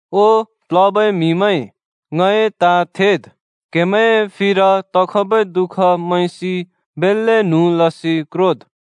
ओ प्लबै म्‍हिमैं, ङए ताँ थेद्। क्‍हेमैंए फिर तखबै दुःख मैंसि बेल्‍ले न्हुँ लसि क्रोद्।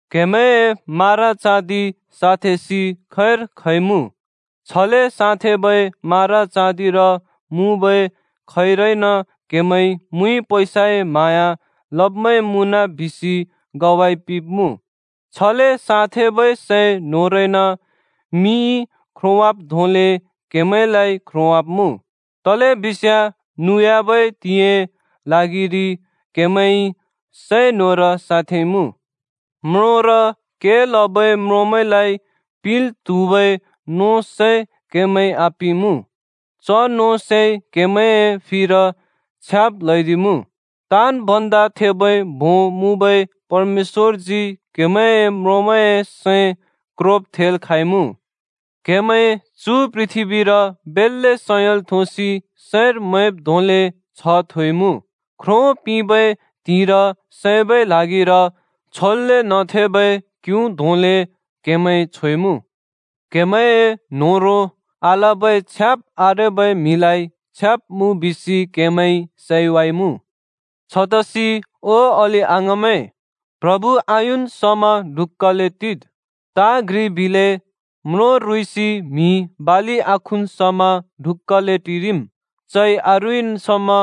क्‍हेमैंए मारा चाँदि साँथेंसि खैर खइमुँ। छले साँथेंबै मारा चाँदिर मुँबै खैरइन क्‍हेमैं मुइ पैसाए म्हाँया लब्‍मैं मुँन बिसि ग्वाइ पिंब्‍मुँ। छले साँथेंबै सै न्होरइन मिइ ख्रोंवाब् धोंले क्हेमैंलाइ ख्रोंवाब्‍मुँ। तलेबिस्याँ नुयाबै त्हिंइए ल्हागिरि क्‍हेमैंइ सै न्होर साँथेंइमुँ। म्रोंर के लबै म्रोंमैंलाइ पिंल् त्हुबै नों सै क्‍हेमैंइ आपिंइमुँ। च नों सैइ क्हेमैंए फिर छ्याब् ल्हैदिइमुँ। ताँन् भन्दा थेबै भों मुँबै परमेश्‍वरजी क्‍हेमैंए म्रोंमैंए सैं क्रोब थेल् खाँइमुँ। क्‍हेमैं चु पृथ्‍बीर बेल्‍ले सयल थोसि सैंर मैंब् धोंले छ्ह थोइमुँ। ख्रो पिंबै त्हिंइर सैबै ल्हागिर छोल्‍ले न्‍हथेंबै क्यु धोंले क्‍हेमैं छोइमुँ। क्‍हेमैंए न्होह्रों आलबै छ्याब् आरेबै म्‍हिलाइ छ्याब मुँ बिसि क्हेमैंइ सैवाइमुँ। छतसि ओ अलि-अङाँमैं, प्रभु आयुन् समा ढुक्‍काले टिद्। ताँ घ्रि बिले, म्रों रुँइँसि म्‍हिइ बालि आखुन् समा ढुक्‍काले टिरिम्। चइ आरुँइँन् समा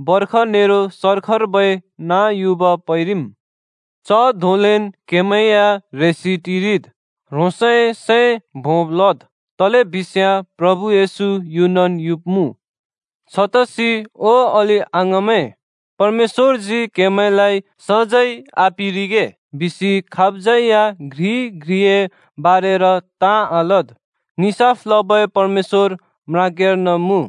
बर्ख नेरो सर्खर्बै नाँ युब पैंरिम्। च धोंलेन् क्‍हेमैं या ह्रेसि टिरिद्। ह्रोंसए सैं भोंब् लद्, तलेबिस्याँ प्रभु येशू युनन् युब्मुँ। छतसि ओ अलि-अङाँमैं, परमेश्‍वरजी क्‍हेमैंलाइ सजैं आपिंरिगे बिसि खाबज्‍यै या घ्रिइ घ्रिए बारेर ताँ आलद्। निसाफ लबै परमेश्‍वर म्राग्याँर्न मुँ।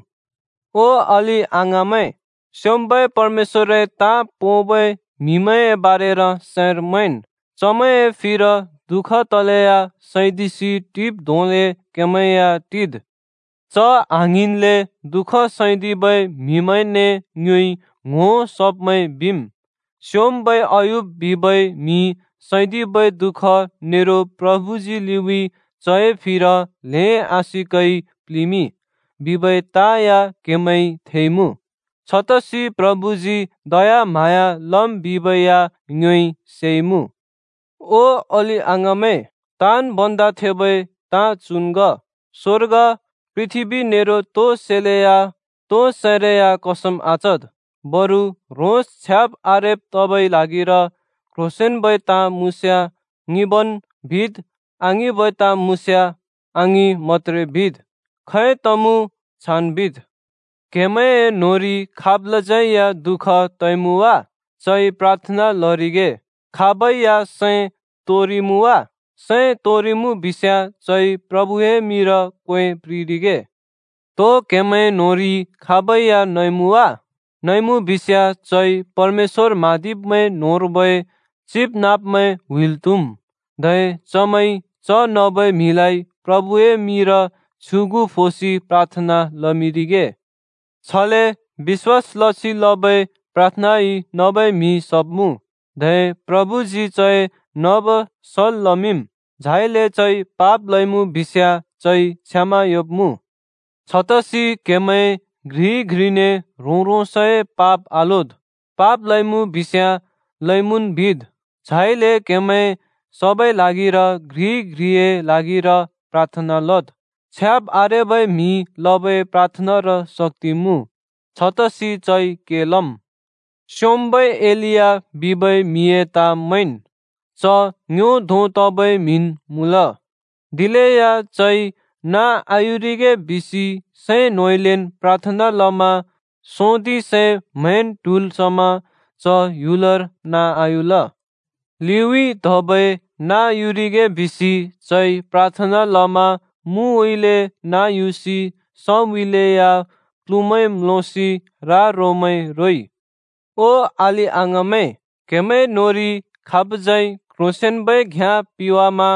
ओ अलि-अङाँमैं, स्‍योंम्‍बै परमेश्‍वरए ताँ पोंबै म्हिमैंए बारेर सैंर मैंन्। चमैंए फिर दुःख तलेया सैदिसि टिब् धोंले क्हेमैं या टिद्। च आङ्हिंन्ले दुःख सैदिबै म्‍हिमैंने ङ्योइ ङ्‍हो सब्मैं बिम्। स्‍योंम्‍बै अय्यूब बिबै म्‍हिइ सैदिबै दु:ख नेरो प्रभुजी लिउँइँ चए फिर ल्हें आशिकइ प्लिंमिंइ बिबै ताँ या क्‍हेमैंइ थेइमुँ। छतसि प्रभुजी दयाम्हाँया लम् बिबै या ङ्योइ सेइमुँ। ओ अलि-अङाँमैं, ताँन् भन्दा थेबै ताँ चुन् ग: स्‍वर्ग, पृथ्‍बी नेरो अरु तोइ सैए मिंर कसम आचद्। बरु ह्रोंस छ्याब आरेब् तबै ल्हागिर क्ह्रोंसेंन्बै ताँ मुँस्याँ “ङिंबन्” बिद्, आङिंबै ताँ मुँस्याँ “आङिं” मत्‍त्रे बिद्। खै तमुँ, छान् बिद्। क्‍हेमैंए न्‍होंरि खाबलाज्यै या दुःख तइमुँ वा? चइ प्राथना लरिगे। खाबै या सैं तोंरिइमुँ वा? सैं तोंरिइमुँ बिस्याँ चइ प्रभुए मिंर क्वे प्रिंरिगे। तो क्‍हेमैं न्‍होंरि खाबै या नइमुँ वा? नइमुँ बिस्याँ चइ परमेश्‍वर म्हाँदिब्मैं न्‍होंर्बै चिबनाँब्मैं हुइल् त्‍हुम्, धै चमैंइ च नबै म्‍हिलाइ प्रभुए मिंर छ्युगु फोसि प्राथना लमिंरिगे। छले बिश्‍वास लसि लबै प्राथनाइ नबै म्‍हि सब्‍मुँ। धै प्रभुजी चए नब सल् लमिंम्, झाइले चइ पाप लइमुँ बिस्याँ चइ क्षमा योंब्‍मुँ। छतसि क्‍हेमैं घ्रिइ घ्रिने ह्रों-ह्रोंसए पाप आलोद्, पाप लइमुँ बिस्याँ लइमुँन् बिद्। झाइले क्हेमैं सबै ल्हागिर घ्रिइ घ्रिए ल्हागिर प्राथना लद्। छ्याब आरेबै म्हिइ लबै प्राथनार शक्ति मुँ, छतसि चइ के लम्। स्‍योंम्‍बै एलिया बिबै म्‍हिए ताँ मैंन्। च ङ्यो धों तबै म्‍हिन् मुँल। दिलेया चइ नाँ आयुरिगे बिसि सैं न्होंउँइँलेन् प्राथना लमा सोंदिं से म्हैंन ट्हुल् समा च ह्‍युलर नाँ आयुल। लिउँइँ धबै नाँ युरिगे बिसि चइ प्राथना लमा मुउँइँले नाँ युसि सउँइँले या प्लुमैं म्‍लोसि रा-रोमैं रोइ। ओ अलि-अङाँमैं, क्‍हेमैं न्‍होंरि खाबज्यै क्ह्रोंसेंन्बै घ्‍याँ पिवामा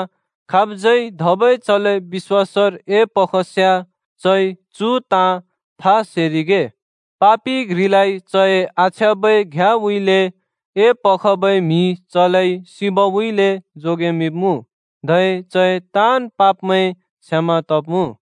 खाबज्यै धबै चलाइ बिश्‍वासर एपखस्याँ, चइ चु ताँ था सेरिगे: पापि घ्रिलाइ चए आछ्याँबै घ्‍याँउँइँले एपखबै म्हिइ चलाइ सिबउँइँले जोगेमिंब्मुँ, धै चए ताँन् पापमैं क्षमा तब्मुँ।